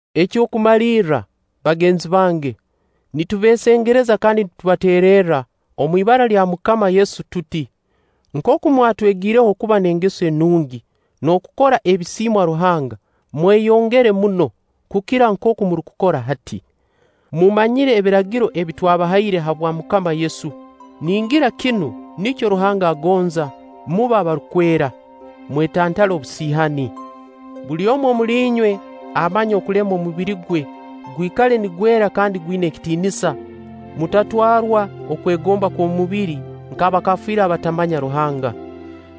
Eky'okumalirra, bagenzi bange, nitubeesengerereza kandi nitubateererra omu ibara lya MUKAMA Yesu tuti: nkooku mwatwegiireho okuba n'engeso enungi n'okukora ebisiimwa Ruhanga, mweyongere muno, kukira nkooku murukukora hati. Mumanyire ebiragiro ebi twabahaire habwa MUKAMA Yesu. Ningira kinu nikyo Ruhanga agonza: mube abarukwera, mwetantale obusiihani. Buli omu omuli inywe amanye okulema omubiri gwe gwikale nigwera kandi gwina ekitiinisa; mutatwarwa okwegomba okw'omubiri nk'abakafiiiri abatamanya Ruhanga.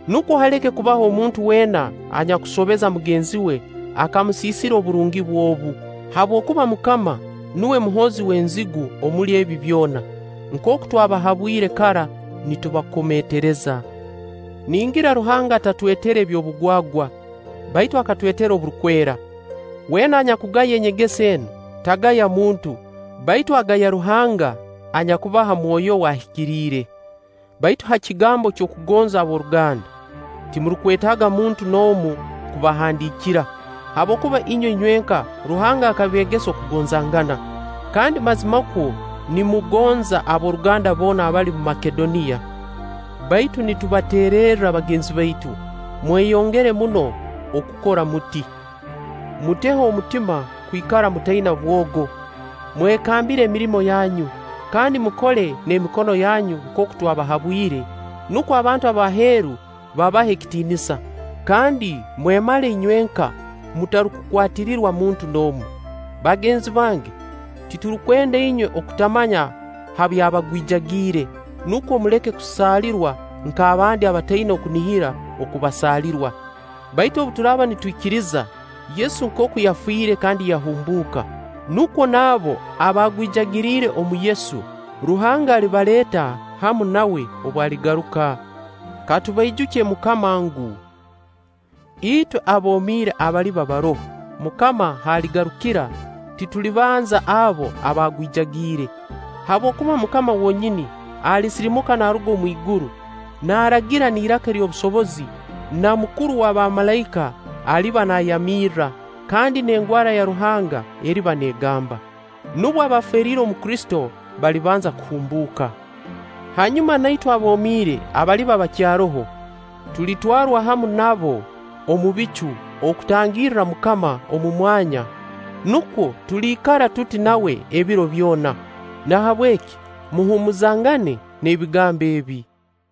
Nukwo haleke kubaho muntu weena anyakusobeza mugenzi we akamusiisira oburungi bwe obu, habwokuba MUKAMA nuwe muhoozi w'enzigu omuli ebi byona, nkooku twabahabwire kara nitubakomeetereza. Ningira Ruhanga atatwetere eby'obugwagwa, baitu akatwetera oburukwera. Weena anyakugaya enyegesa enu, tagaya muntu, baitu agaya Ruhanga anyakubaha Mwoyo we Ahikiriire. Baitu ha kigambo ky'okugonza ab'oruganda, timurukwetaaga muntu n'omu kubahandiikira, habwokuba inywe inywenka Ruhanga akabeegesa okugonzangana; kandi mazimakwo nimugonza ab'oruganda boona abali omu Makedoniya. Baitu nitubateererra bagenzi baitu, mweyongere muno okukora muti. Muteho omutima kwikara mutaina bwogo, mwekambire emirimo yanyu, kandi mukole n'emikono yanyu nkooku twabahabwire, nukwo abantu b'aheeru babahe akitiinisa, kandi mwemale inywenka mutarukukwatirirwa muntu n'omu. Bagenzi bange, tirurukwenda inywe okutamanya ha by'abaagwijagiire nukwo muleke kusaalirwa nk'abandi abataina kunihira oku basaalirwa. Baitu obu turaaba nitwikiriza Yesu nkooku yafiire kandi yahumbuuka, nukwo n'abo abaagwijagiriire omu Yesu, Ruhanga alibaleeta hamu nawe obu aligaruka. Ka tubaijukye MUKAMA ngu, itwe aboomire abaliba baroho MUKAMA haaligarukira, titulibanza abo abaagwijagiire. Habwokuba MUKAMA wonyini alisirimuka naaruga omwiguru, naaragira n'iraka ery'obusobozi, na mukuru wa bamalaika aliba naayamirra, kandi n'engwara ya Ruhanga eriba neegamba. Nubwo abaafeeriire omu Kristo balibanza kuhumbuuka. Hanyuma na itwe aboomiire abaliba bakyaroho, tulitwarwa hamu nabo omu bicu okutangirra MUKAMA omu mwanya; nukwo tuliikara tuti nawe ebiro byona. Nahabweki muhuumuzangane n'ebigambo ebi.